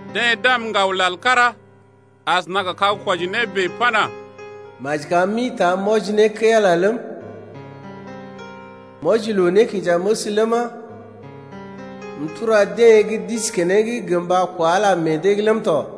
Deḛ d’am ŋgawlal kára asəna gə kag-kwɔji-né bèe pana: Maji kam m’ḭta m’wɔji ne kəi-Ala ləm, m’wɔji loo-nékinjaməs ləma, m’tura deḛ gə́ d’isi keneŋ gə mba kwa Ala meḛ dee’g ləm tɔ.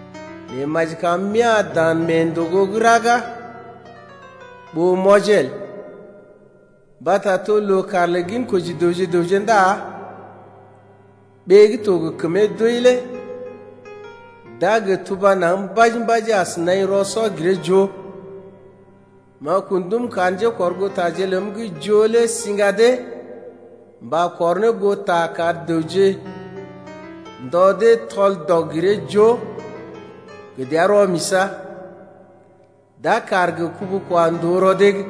Nɛ maji kam m’ya̰ dan mee ndògo gə́ raga ɓó m’wɔjee el, mbata to loo-kaar lə ginkoji dəwje gə raŋg ndá ɓee gə́ to gə kəmee doi lé d’a gə tuba naŋg mbaji-mbaji as naḭ rɔ-sɔ-giree-joo. M’a kun ndum kar njékɔrgootaje ləm gə́ joo lé siŋga dee mba kɔr ne goo ta kar ndɔ dee tɔl-dɔg-giree-joo gə dəa rɔ-misa̰, d’a kaar gə kubu-kwa-ndòo rɔ dee’g.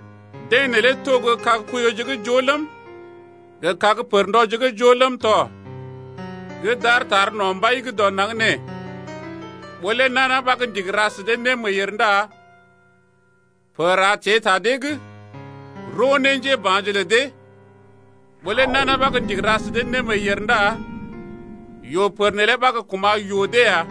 Deḛ neelé to gə́ kag koiyoje gə́ joo ləm, gə kag pərndɔje gə́ joo ləm tɔ gə́ d’aar tar no̰ Mbai dɔ naŋg nee. Ɓó lé nana ɓa ndigi ra sə dee némeeyèr ndá pər a teḛ ta dee’g roo ne njéba̰je lə dee. Ɓó lé nana ɓa gə́ ndigi ra sə dee némeeyèr ndá yoo-pər neelé ɓa gə́ kuma̰ yoo dee ya.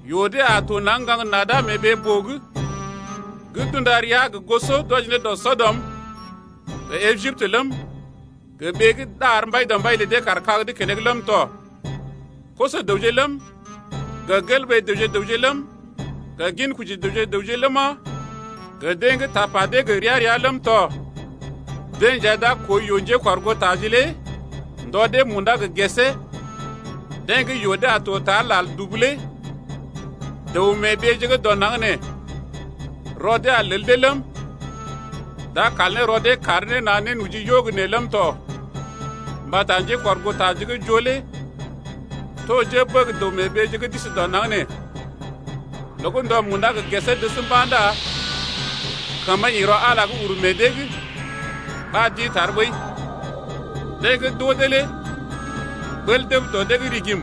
Yoo dee a to naŋg ŋgaŋ nada mee ɓee-boo’g gə́ d’unda ria gə goso d’wɔji ne dɔ Sɔdɔm gə Ejiptə ləm, gə ɓee gə́ ɗar Mbaidɔmbaije lə dee kaar kag’d keneŋ ləm tɔ. Koso-dəwje ləm, gə gelɓee dəwje-dəwje ləm, gə ginkoji dəwje gə raŋg ləma, gə deḛ gə́ tapa dee to gə ria-ria ləm tɔ, deḛ nja d’a koo yoo njékɔrgootaje lé ndɔ dee munda gə gesee, deḛ gə́ yoo dee a to tar lal dubu lé. Dəw-mee-ɓeeje gə́ dɔ naŋg nee rɔ dee a lel dee ləm, d’a kal ne rɔ dee kar ne na̰ nénoji yo gə́ nee ləm tɔ mbata njékɔrgootaje gə́ joo lé to njébəg dəw-mee-ɓeeje gə́ d’isi dɔ naŋg nee. Loo gə́ ndɔ munda gə gesee dəs mba̰ ndá kəmə ḭ rɔ Ala’g uru meḛ dee’g ɓa d’ḭ tar ɓəi. Deḛ gə́ d’oo dee lé ɓəl dəb dɔ dee’g rigim.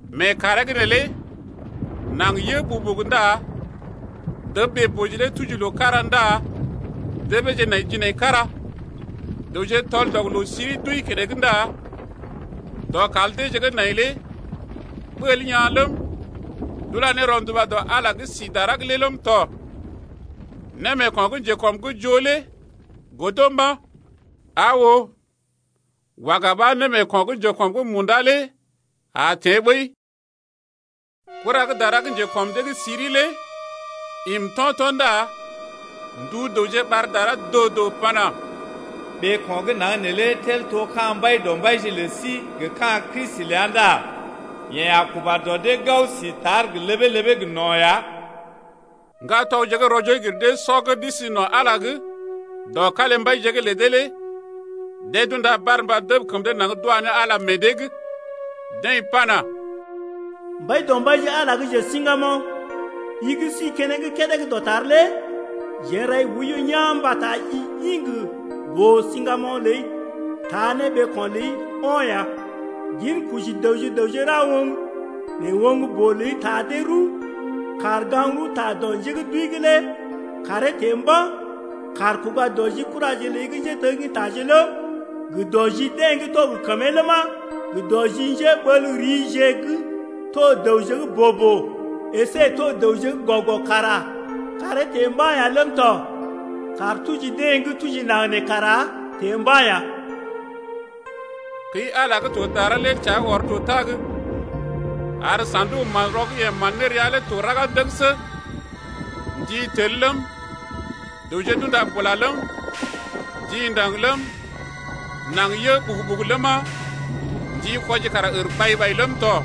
Mee kàree’g neelé naŋg yə ɓugu-ɓugu ndá dəb ɓee-boo lé tuji loo-kára ndá debeeje nai jinaikara. Dəwje tɔl-dɔg-loo-siri d’wəi keneŋ ndá dɔkal deeje gə́ nai lé ɓəl yaa̰ ləm, d’ula ne rɔnduba dɔ Ala’g gə́ si dara lé ləm tɔ. Némeeko̰ gə́ njekɔm’g joo lé godo mba̰. Aa oo, waga ɓa némeeko̰ gə́ njekɔm’g munda lé a teḛ ɓəi. Kura gə́ dara gə́ njekɔm dee’g siri lé im to̰to̰ ndá ndu dəwje ɓar dara doo-doo pana: Ɓeeko̰ gə́ naŋg neelé tel to ka̰ Mbaidɔmbaije lə sí gə ka̰ Kristi ləa ndá yeḛ a kuba dɔ dee gao sí tar gə ləbee-ləbee gə no̰ ya. Ŋgatɔgje gə́ rɔ-joo-gir-dee-sɔ gə́ d’isi no̰ Ala’g dɔ kalimbaije’g lə dee lé deḛ d’unda barmba dəb kəm dee naŋg d’wa ne Ala meḛ dee’g. Deḛ pana: Mbaidɔmbaije Ala gə́ njesiŋgamoŋ, i gə́ si keneŋ kédé gə́ dɔtar lé jeḛ n’rai oiyo yaa̰ mbata i ḭ gə boo-siŋgamoŋ ləi taa ne ɓeeko̰ ləi o̰ ya. Ginkoji dəwje gə raŋg ra oŋg, nɛ oŋg-boo ləi taa dee rəw, kàr gaŋg-rəwta dɔ njé gə́ d’wəi’g lé kàree teḛ mba̰, kàr kuga dɔ ji kuraje ləi gə́ njéteggintaje ləm, gə dɔ ji deḛ gə́ to gə kəmee ləma, gə dɔ ji njéɓel riije gə́ to dəwje gə́ boo-boo əsé to dəwje gə́ gɔ-gɔ kara kàree teḛ mba̰ ya ləm tɔ. Kàr tuji deḛ gə́ tuji naŋg nee kara teḛ mba̰ ya. Kəi-Ala gə́ to dara lé təa ɔr to tag, ar sa̰duk-manrɔ gə́ yeḛ man ne rəa lé to raga ndəgəsə. Ndi tel ləm, dəwje d’unda bula ləm, ndi ndaŋg ləm, naŋg yə ɓugu-ɓugu ləma, ndi kwɔji kara ər ɓai-ɓai ləm tɔ.